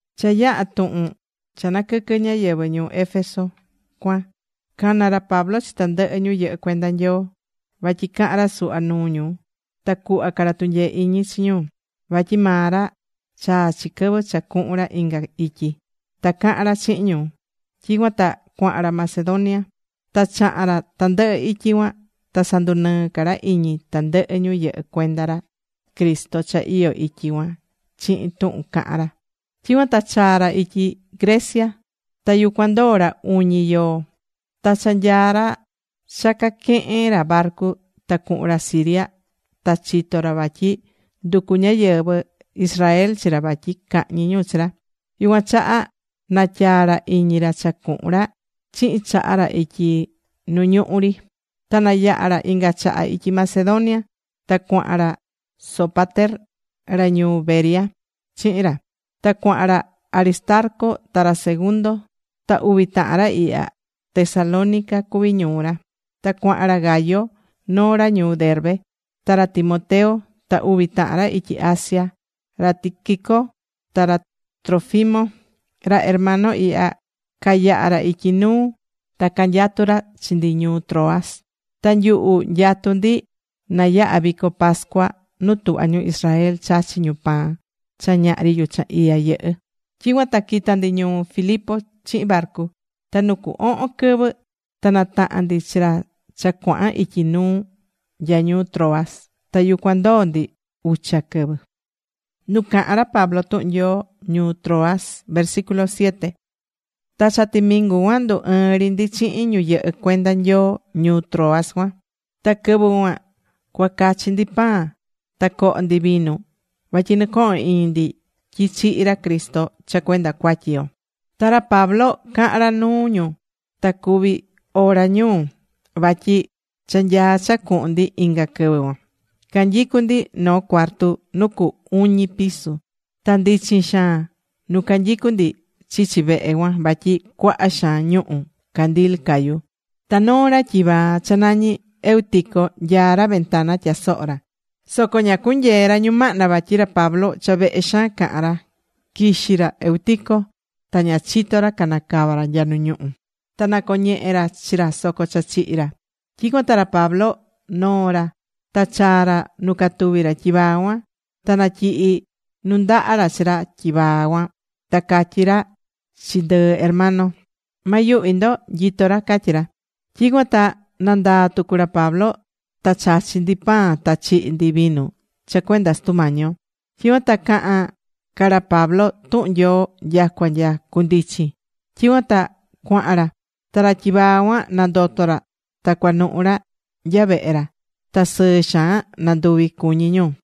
Cha yaha̱ tuhun cha naquɨquɨ̱ ñáyɨvɨ ñuu Éfeso cuan, cana̱ ra Pablo chi tandɨhɨ ñu yɨhɨ́ cuenda Nyoo, vatyi cahan ra suhva nuu ñu ta cuhva ca ra tunyee iñi chi ñu. Vatyi maa ra chaa̱ chi quɨvɨ cha cuhun ra inga ityi. Ta caha̱n ra chihin ñu. Tyicuan ta cuaha̱n ra Macedonia. Ta chaha̱n ra tandɨhɨ ityi cuan ta sandunɨɨ̱ ca ra iñi tandɨhɨ ñu yɨhɨ́ cuenda ra Cristo cha iyó ityi cuan chihin tuhun cahán ra. Tyicuan ta chaa̱ ra ityi Grecia. Ta yucuan ndoo̱ ra uñi yoo. Ta cha nyaá ra cha cuaquehen ra barcu ta cuhun ra Siria, ta chito̱ ra vatyi nducú ñáyɨvɨ Israel chi ra vatyi cahñi ñu chi ra. Yucuan chaha natyaa̱ ra iñi ra cha cuhun ra chihin chaha ra ityi nu ñuhu ri. Ta nayaha̱ ra inga chaha ityi Macedonia. Ta cuaha̱n ra Sópater, ra ñuu Berea chihin ra. Ta cuaha̱n ra Aristarco ta ra Segundo, ta uvi tahan ra ihya, Tesalónica cuví ñuu ra. Ta cuaha̱n ra Gayo, noo ra ñuu Derbe, ta ra Timoteo, ta uvi tahan ra ityi Asia, ra Tíquico ta ra Trófimo. Ra hermano ihya cayaha̱ ra ityi nuu ta canyatú ra chi ndi ñuu Troas. Ta nyuhu nyatu̱ ndi na yaha vico pascua nu tuhvá ñu Israel chachí ñu pan cha ñahri yuchan iya yɨhɨ́. Tyicuan ta quita̱ ndi ñuu Filipo chihin barcu. Ta nu cu ohon quɨvɨ ta nataha̱n ndi chi ra cha cuaha̱n ityi nuu nya ñuu Troas. Ta yucuan ndoo̱ ndi ucha quɨvɨ.Nu cahán ra Pablo tuhun Nyoo ñuu Troas Ta cha timingu cuan ndu ɨɨ́n ri ndi chihin ñu yɨhɨ́ cuenda Nyoo ñuu Troas cuan. Ta quɨvɨ cuan cuacachi ndi pan ta coho ndi vinu vatyi nɨcohon iñi ndi tyi chihi̱ ra Cristo cha cuenda cuatyi yo. Ta ra Pablo cahán ra nuu ñu ta cuvi ora ñuu, vatyi cha nyaá cha cuhun ndi inga quɨvɨ cuan. Canyicú ndi noo cuarto nu cu uñi piso. Ta ndichin xaan nu canyicú ndi chichi vehe cuan vatyi cuaha xaan ñuhu̱ candil cayú. Ta noo ra tyivaa cha nañí Eutico nyaá ra ventana tyasohó ra, soco ña cunyee̱ ra ñumahna vatyi ra Pablo, cha vehe xaan cahan ra. Quixí ra Eutico, ta ña chito̱ ra canacava̱ ra nya nu ñuhu. Ta nacoñehé ra chi ra soco cha chihi̱ ra. Tyicuan ta ra Pablo noo̱ ra ta chaa̱ ra nu catuví ra tyivaa cuan. Ta natyihi nundaha ra chi ra tyivaa cuan, ta catyí ra chi ndɨɨ hermano: ―Ma yuhvi ndo. Nyitó ra ―catyí ra. Tyicuan ta nandaa̱ tucu ra Pablo ta chachi̱ ndi pan ta chihi̱ ndi vinu cha cuenda Sutu Mañi yo. Tyicuan ta cahan ca ra Pablo tuhun Nyoo nyacua nya cundichin. Tyicuan ta cuaha̱n ra. Ta ra tyivaa cuan nandoto̱ ra ta cuanuhu̱ ra nya vehe ra. Ta sɨɨ xaan nanduvi̱ cuñi ñu.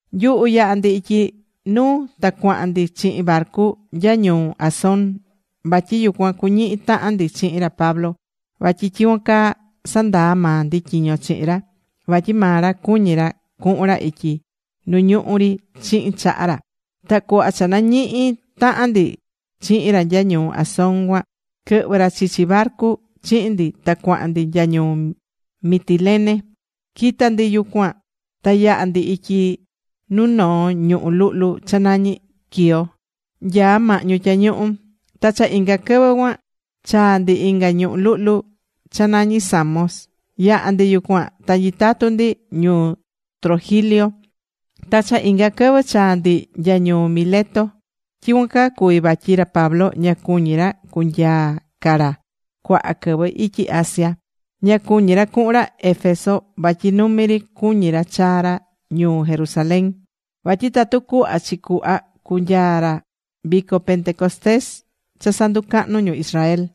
Nyuhu yaha̱ ndi ityi nuu ta cuahan ndi chihin barcu nya ñuu Asón. Vatyi yucuan cuñihi tahan ndi chihin ra Pablo, vatyi tyicuan caa sandaa̱ maa ndi tyiño chihin ra. Vatyi maa ra cuñí ra cuhun ra ityi nu ñuhú ri chihin chaha ra. Ta cuhva cha nañihi̱ tahan ndi chihin ra nya ñuu Asón cuan, quɨhvɨ̱ ra chichi barcu chihin ndi ta cuahan ndi nya ñuu Mitilene. Quita̱ ndi yucuan ta yaha̱ ndi ityi nuu noo ñuhú luhlu cha nañí Quío nyaá mahñu tyañuhu. Ta cha inga quɨvɨ cuan chaa̱ ndi inga ñuhú luhlu cha nañí Samos. Yaha̱ ndi yucuan ta nyitatu̱ ndi ñuu Trogilio. Ta cha inga quɨvɨ chaa̱ ndi nya ñuu Mileto. Tyicuan caa cuvi̱ vatyi ra Pablo ña cuñi̱ ra cunyaa̱ ca ra cuaha quɨvɨ ityi Asia. Ña cuñí ra cuhun ra Éfeso vatyi numi ri cuñí ra chaa ra ñuu Jerusalén, vatyi tatu cuhva chi cuhva cunyaa ra quɨvɨ vico Pentecostés cha sanducahnú ñu Israel.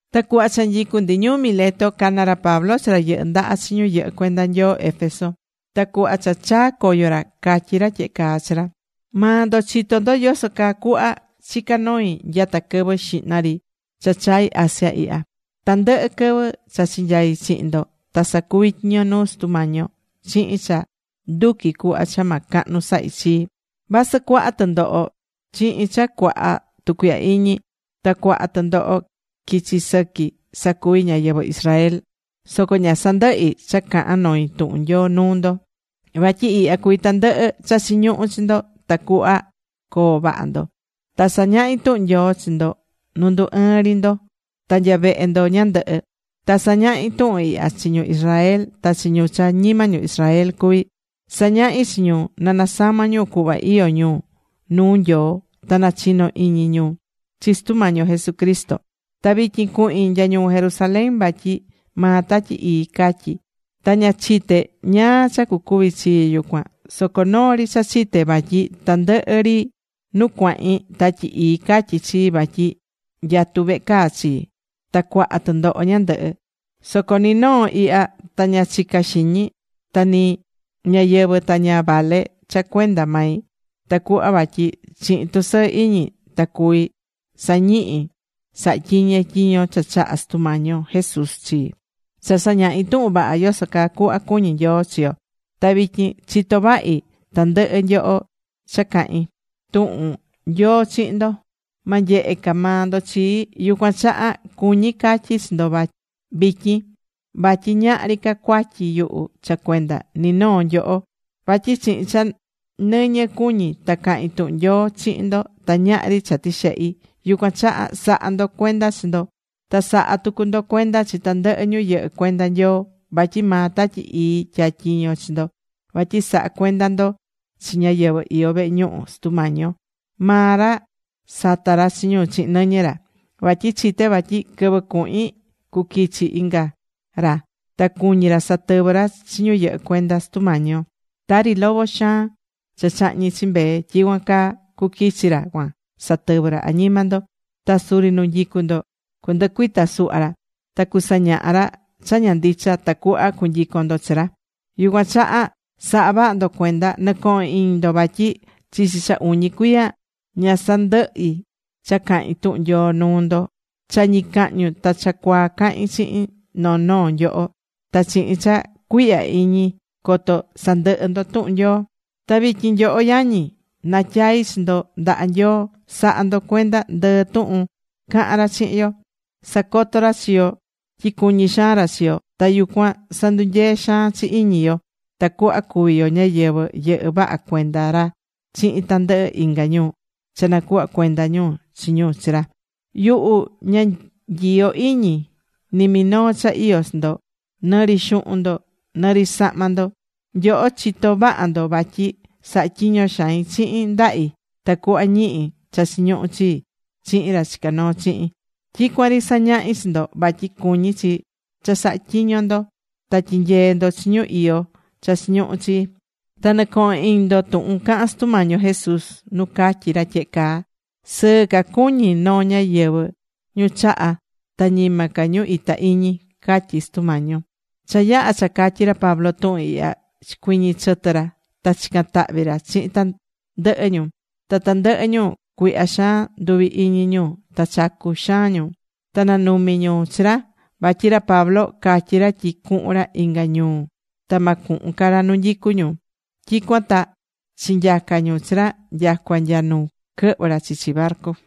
Ta cuhva cha nyicu ndi ñuu Mileto, cana̱ ra Pablo chi ra yɨhɨ́ ndaha chi ñu yɨhɨ́ cuenda Nyoo Éfeso. Ta cuhva cha chaa̱ coyo ra, catyí ra tyehe caa chi ra: ―Maa ndo chitó ndo yoso caa cuhva chica̱ noi nyata quɨvɨ xihna ri cha chai̱ Asia ihya. Tandɨhɨ quɨvɨ cha chinyai̱ chihin ndo ta sacuvi̱ tyiño nuu Sutu Mañi yo chihin cha nduquí cuhva cha ma cahnu sahi chii, vasɨ cuaha tɨndoho chihin cha cuaha tucuihya iñi. Ta cuaha tɨndoho quichi sɨqui sacuvi̱ ñáyɨvɨ Israel. Soco ña sandɨhí cha cahán noi tuhun Nyoo nuu ndo. Vatyi ihya cuví tandɨhɨ cha chiñuhú chi ndo tacuhva coo vaha ndo. Ta sañahi̱ tuhun Nyoo chi ndo nu ndu ɨɨn ri ndo ta nya vehe ndo ñandɨhɨ. Ta sañahi̱ tuhun ihya chi ñu Israel ta chi ñu cha ñima ñu Israel cuví. Sañahi̱ chi ñu na nasama ñu cuhva iyó ñu nuu Nyoo ta nachino iñi ñu chi Sutu Mañi yo Jesucristo. Ta vityin cuhin nya ñuu Jerusalén vatyi maa Tatyi Ii catyí. Ta ña chité ñáá cha cucuvi chii yucuan. Soco noo ri cha chité vatyi tandɨhɨ ri nu cuahín Tatyi Ii catyí chii vatyi nyatú vehe caa chii, ta cuaha tɨndoho ñandɨhɨ. Soco ni noo ihya ta ña chicá xiñi. Ta ni ñayɨvi̱ ta ña vale cha cuenda mai, tacuhva vatyi chihin tusɨɨ iñi ta cuví sañihi sahatyiñe tyiño cha chaha̱ Sutu Mañi yo Jesús chii, cha sañahi tuhun vaha yoso cuhva cuñí Nyoo chi yo. Ta vityin chitó vahi vatyi tandɨhɨ nyoho cha cahi̱n tuhun Nyoo chihin ndo, ma nyehe ca maa ndo chii. Yucuan chaha cuñí catyi chi ndo vityin vatyi ñahri ca cuatyi yuhu cha cuenda ni noo nyoho. Vatyi chihin cha nɨñɨ cuñí ta cahin tuhun Nyoo chihin ndo ta ñahri cha tixehi̱. Yucuan chaha sa̱ha ndo cuenda chi ndo. Ta sa̱ha tucu ndo cuenda chi tandɨhɨ ñu yɨhɨ́ cuenda Nyoo. Vatyi maa Tatyi Ii tyatyiño̱ chi ndo vatyi saha cuenda ndo chi ñáyɨvɨ iyó vehe ñuhu Sutu Mañi yo. Maa ra sata̱ ra chi ñu chihin nɨñɨ ra. Vatyi chité vatyi quɨvɨ cuhin, cuquichi inga ra. Ta cuñi ra satɨvɨ ra chi ñu yɨhɨ́ cuenda Sutu Mañi yo. Tari lobo xaan cha chahñí chi mbee, tyicuan caa cuquichi ra cuan satɨvɨ ra añima ndo. Ta suri nu nyicu ndo, cundɨcuita suhva ra. Ta cusañaha ra cha ña ndicha tacuhva cunyicon ndo chi ra. Yucuan chaha sa̱ha vaha ndo cuenda. Nɨ̱cohon iñi ndo vatyi chichi cha uñi cuiya ña sandɨhi̱ cha cahín tuhun Nyoo nuu ndo. Cha ñicahñu ta cha cuaa cahi̱n chihin noo noo nyoho, ta chihin cha cuihya iñi coto sandɨhɨ ndo tuhun Nyoo. ’Ta vityin nyoho yañi, natyaí chi ndo ndaha Nyoo. Sa̱ha ndo cuenda ndɨɨ tuhun cahan ra chihin yo. Sacotó ra chi yo tyi cuñí xaan ra chi yo. Ta yucuan sandunyeé xaan chi iñi yo tacuhva cuvi yo ñáyɨvɨ yɨhɨ́ vaha cuenda ra chihin tandɨhɨ inga ñu cha nacuhva cuenda ñu chi ñu chi ra. Yuhu ña nyiyó iñi ni minoo cha iyó chi ndo. Nɨ ri xuhun ndo, nɨ ri sahma ndo. Nyoho chitó vaha ndo vatyi sahá tyiño xain chihin ndahi tacuhva ñihi cha chiñuhú chii chihin ra chicá noo chihin. Tyicuan ri sañahí chi ndo vatyi cuñí chi cha sa̱ha tyiño ndo ta tyi̱nyee ndo chi ñu iyó cha chiñuhu chi. Ta nɨ̱cohon iñi ndo tuhun cahán Sutu Mañi yo Jesús nu catyi̱ ra tyehe caa: “Sɨɨ ca cuñi noo ñáyɨvɨ ñu chahá, ta ñima ca ñu ita iñi”, catyí Sutu Mañi yo. Cha yaha̱ cha catyi̱ ra Pablo tuhun ihya, chicuiñi̱ chɨtɨ ra. Ta chica̱n tahvi ra chihin tandɨhɨ ñu. Ta tandɨhɨ ñu cuihya xaan nduvi iñi ñu ta chacu̱ xaan ñu. Ta nanumi ñu chi ra. Vatyi ra Pablo catyi̱ ra tyi cuhun ra inga ñuu ta ma cuhun ca ra nu nyicu ñu. Tyicuan ta chinyaca̱ ñu chi ra nyacua nya nu quɨhvɨ ra chichi barcu.